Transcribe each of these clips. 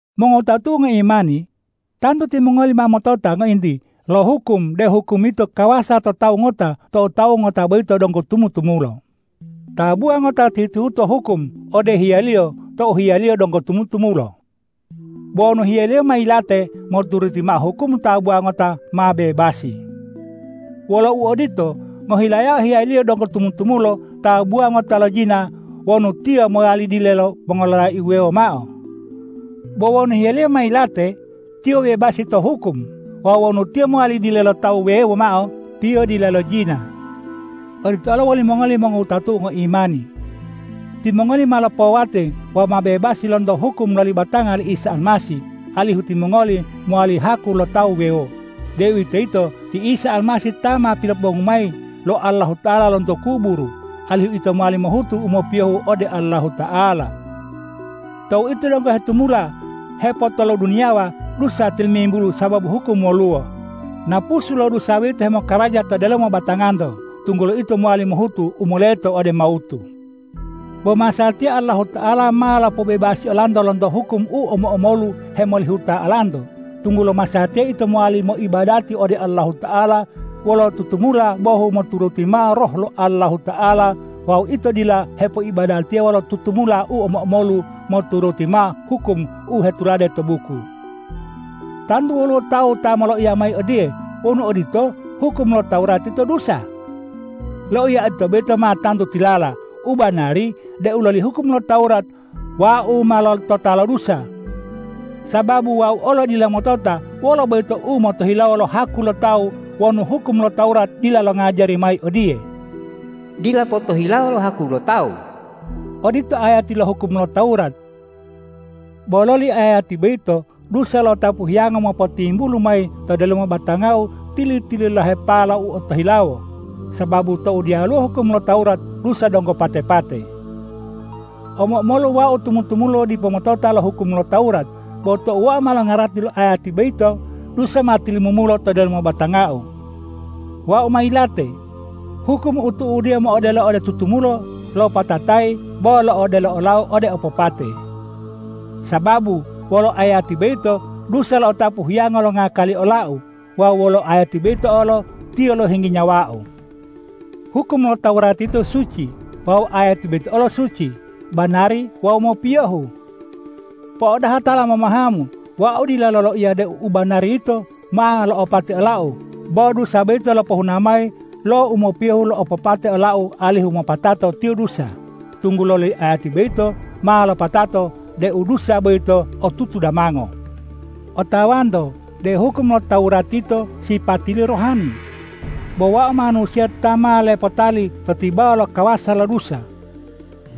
Mongowutatu'u ngoimani, tantu timongoli ma motota ngointi lo hukum deu hukum yito kawasa to tawu ngota tou tawu ngota boyito donggo tumu-tumulo. Tabuwa ngota tihu-tihuto hukum ode hiyaliyo tou hiyaliyo donggo tumu-tumulo. Bo wonu hiyaliyo ma yilate, moturuti mao hukum tabuwa ngota ma bebasi. Wolo uodito, ngohilayao hiyaliyo donggo tumu-tumulo tabuwa ngota lojina wonu tiyo mowali dile lo mongololai wuwewo mao. Bo wonu hiyaliyo ma yilate, tiyo bebasi to hukum; wawu wonu tiyo mowali dile lo tawu wuwewo mao, tiyo dila lojina. Odito olo wolimongoli mongowutatu'u ngoimani: Timongoli ma lopowate wawu ma bebasi lonto hukum loli batanga li Isa Almasih, alihu timongoli mowali haku lo Tawu wuwewo, deuwitoyito ti Isa Almasih ta ma pilopobongu mayi lo Allahuta'ala lonto kuburu, alihu ito mowali mohutu u mopiyohu ode Allahuta'ala. Tou ito donggo hetumula hepotoloduniyawa, dusa tilimimbulu sababu hukum woluwo. Napusu lo dusa boyito hemokaraja to delomo batanganto, tunggulo ito mowali mohutu u moleto ode mawutu. Bo masatiya Allahuta'ala ma lopobebasi olanto lonto hukum u omo-omolu hemolihuta olanto, tunggulo masatiya ito mowali moibadati ode Allahuta'ala wolo tutumula bohu moturuti mao Roh lo Allahuta'ala wawu ito dila hepoibadatiya wolo tutumula u omo-omolu moturuti mao hukum u hetulade to buku. Tantu woluwo tawu ta moloiya mayi odiye,”Wonu odito, hukum lo Tawurat yito dusa!” Loiya odito boyito ma tantu tilala. U banari deu loli hukum lo Tawurat wau ma lotota lo dusa. Sababu wau olo dila motota wolo boyito umotohilawo lo haku lo tawu wonu hukum lo Tawurat dila longajari mayi odiye,”Dila potohilawo lo haku lo tawu.” Odito ayati lo hukum lo Tawurat. Bo loli ayati boyito dusa lo'otapu hiyango mopotimbulu mayi to delomo batangau tili-tililahepala lo u otohilawo, sababu tou diyaluwo hukum lo Tawurat, dusa donggo pate-pate. Omo-omolu wau tumu-tumula dipo motota lo hukum lo Tawurat. Bo tou wau ma longarati lo ayati boyito, dusa ma tilimumulo to delomo batangau. Wau ma yilate. Hukum u tu'udiyo mo'odelo ode tutumulo lopatatayi bo lo'odelo olau ode opopate. Sababu wolo ayati boyito, dusa lo'otapu hiyango longakali olau. Wawu wolo ayati boyito olo, tiyo lohinggi nyawau. Hukum lo Tawurat yito suci wawu ayati boyito olo suci, banari wawu mopiyohu. Po'odaha tala momahamu, wau dila loloiya deu u banari yito ma lo'opate olau. Bo dusa boyito lopohuna mayi lo u mopiyohu lo'opate olau alihu mopatato tiyo dusa, tunggulo loli ayati boyito ma lopatato deu dusa boyito otutu damango. Otawanto deu hukum lo Tawurat yito sipatiliyo rohani. Bo wau manusiya ta ma lepotali to tibawa lo kawasa lo dusa.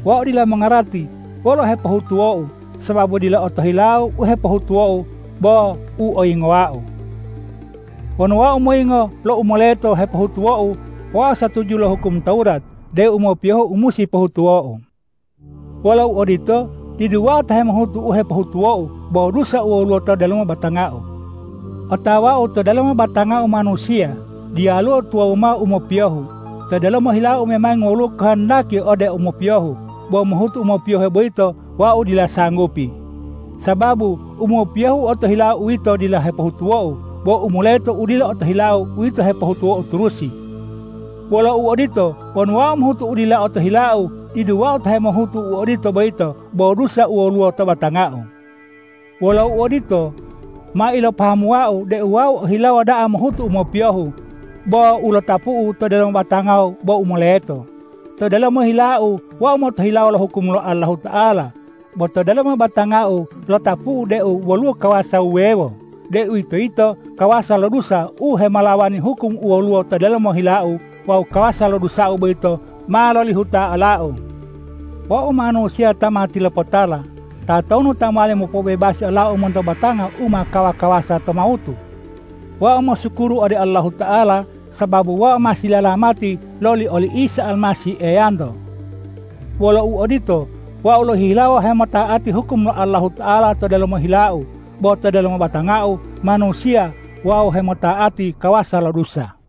Wau dila mongarati wolo u hepohutuwou, sababu dila u otohilau u hepohutuwou bo u oyingowau. Wonu wau moyingo lo u moleta hepohutuwou, wau satuju wolo hukum lo Tawurat deu u mopiyohu u musi pohutuwou. Wolo uodito, didu wau ta hemohutu u hepohutuwou bo dusa u woluwo to delomo batangau. Otawau to delomo batangau manusiya diyaluwo tuwawu mao u mopiyohu. To delomo hilau memangi woluwo kohondaki ode u mopiyohu. Bo mohutu u mopiyohe boyito wau dila sanggupi. Sababu u mopiyohu u otohilau uwito dila hepohutuwou, bo u moleto u dila otohilau uwito u hepohutuwou turusi. Wolo uodito, wonu wau mohutu u dila otohilau, didu wau ta hemohutu u odito boyito bo dusa u woluwo to batangau. Wolo uodito, ma ilopahamuwau deu wau ohilawo da'a mohutu u mopiyohu, bo u lotapu'u to delomo batangau bo u moleto. To delomo hilau wau motohilawo lo hukum lo Allahuta'ala. Bo to delomo batangau lotapu'u deu woluwo kawasa wuwewo, deuwitoyito kawasa lo dusa u hemolawani hukum u woluwo to delomo hilau wawu kawasa lo dusau boyito ma lolihuta olau. Wau manusiya ta ma tilopotala! Tatonu ta mowali mopobebasi olau monto batanga u ma kawa-kawasa to mawutu? Wau mosukuru ode Allahuta'ala sababu wau ma silalamati loli oli Isa Almasih Eyanto. Wolo uodito, wau lohihilawo hemota'ati hukum lo Allahuta'ala to delomo hilau, bo to delomo batangau manusiya wau hemota'ati kawasa lo dusa.